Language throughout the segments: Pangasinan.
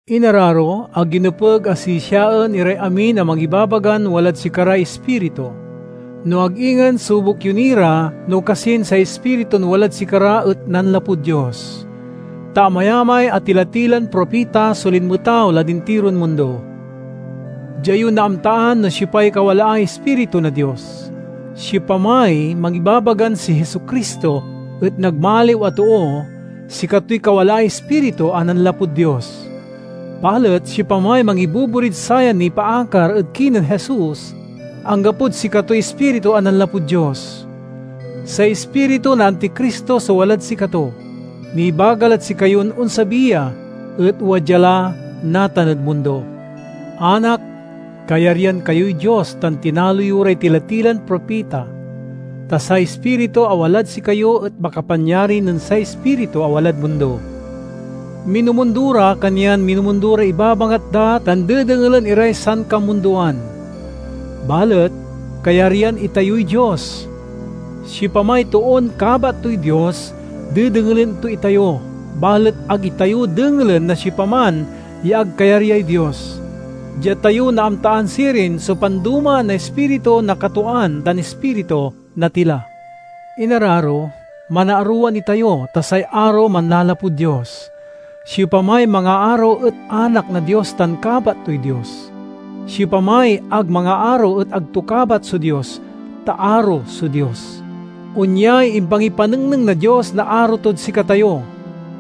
Inararo, ag yo nepeg a sisiaen iray amin a mangibabagan walad sikaray Ispiritu, no ag ingen sobuk yo ni ra no kasin say ispiritun walad sikara et nanlapud Dios. Ta amayamay a tila-tilan propita so linmetaw lad intiron mundo. Dia yo naamtaan no siopay kawalaay Ispiritu na Dios: siopamay mangibabagan si Jesu-Cristo et nagmaliw a too, sikatoy kawalaay Ispiritu a nanlapud Dios. Balet siopamay mangiboborid sayan nipaakar ed kinen Jesus, anggapod sikatoy Ispiritu a nanlapud Dios. Say ispiritu na Anticristo so walad sikato. Nibaga lad sikayon onsabi ya, et wadya la natan ed mundo. Anak, kayaryan kayoy Dios tan tinalo yo ray tila-tilan propita, ta say Ispiritu a walad sikayo et makapanyari nen say ispiritu a walad mundo. Minumundo ra, kanyan minumundo ray ibabangat da tan dedengelen iray sankamundoan. Balet kayaryan itayoy Dios. Siopamay toon kabat toy Dios, dedengelen to itayo, balet ag itayo dengelen na siopaman ya ag kayaryay Dios. Dia tayo naamtaan sirin so pandomaan na Ispiritu na katwaan tan ispiritu na tila. Inararo, manaarowan itayo, ta say aro manlalapud Dios. Siopamay mangaaro et anak na Dios tan kabat toy Dios. Siopamay ag mangaaro et ag to kabat so Dios, ta aro so Dios. Onyay impangipanengneng na Dios na aro tod sikatayo: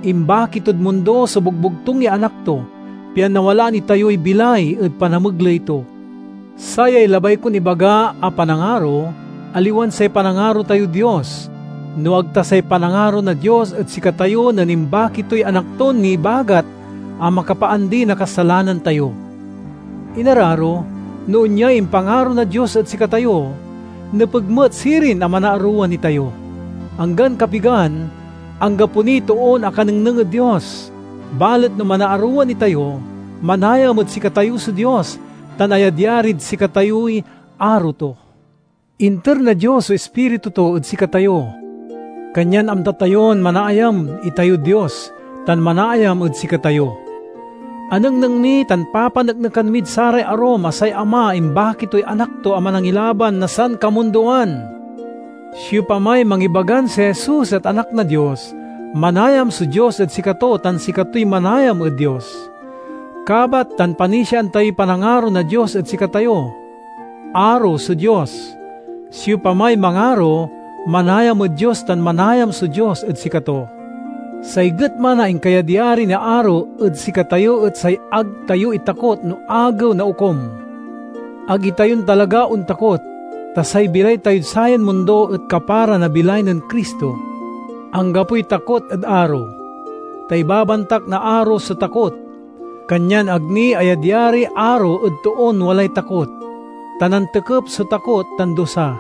imbaki tod mundo so bogbogtung ya Anak to, pian nawalaan itayoy bilay ed panamegley to. Sayay labay kon ibaga a panangaro: aliwan say panangaro tayod Dios, no ag ta say panangaro na Dios ed sikatayo nen imbaki toy Anak ton nibagat a makapaandi na kasalanan tayo. Inararo, no onyay impangaro na Dios ed sikatayo, nepeg met sirin a manaarowan itayo. Anggan kapigan, anggapo niy toon akanengneng ed Dios, balet no manaarowan itayo, manayam ed sikatayo so Dios tan ayadyarid sikatayoy aro to. Inter na Dios so Ispiritu to ed sikatayo, kanyan amta tayon manaayam itayod Dios tan manaayam ed sikatayo. Anengneng mi tan papaneknekan mid saray arum a say Ama imbaki toy Anak to a Manangilaban na sankamundoan. Siopamay mangibagan si Jesus et Anak na Dios, manayam so Dios ed sikato tan sikatoy manayam ed Dios. Kabat tan panisiaan tayoy panangaro na Dios ed sikatayo. Aro so Dios. Siopamay mangaro, manayam ed Dios tan manayam so Dios ed sikato. Say getma na inkayadyari na aro ed sikatayo et say ag tayo itakot no Agew na Okum. Ag itayon talaga ontakot, ta say bilay tayod sayan mundo et kapara na bilay nen Cristo. Anggapoy takot ed aro, ta ibabantak na aro so takot. Kanyan ag ni ayadyariy aro ed toon walay takot, ta nantekep so takot tan dusa.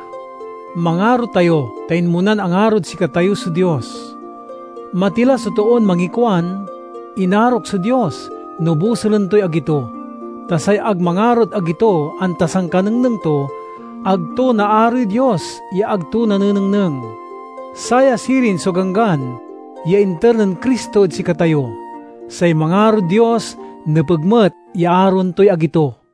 Mangaro tayo, ta inmonan angarod sikatayo so Dios. Matila so toon mangikuan, "Inarok so Dios," no bosulen toy agi to. Ta say ag mangarod agi to anta sankanengneng to, ag to naaroy Dios ya ag to nanenengneng. Saya sirin so ganggan ya inter nen Cristo ed sikatayo: say mangarod Dios nepeg met ya aroen toy agi to.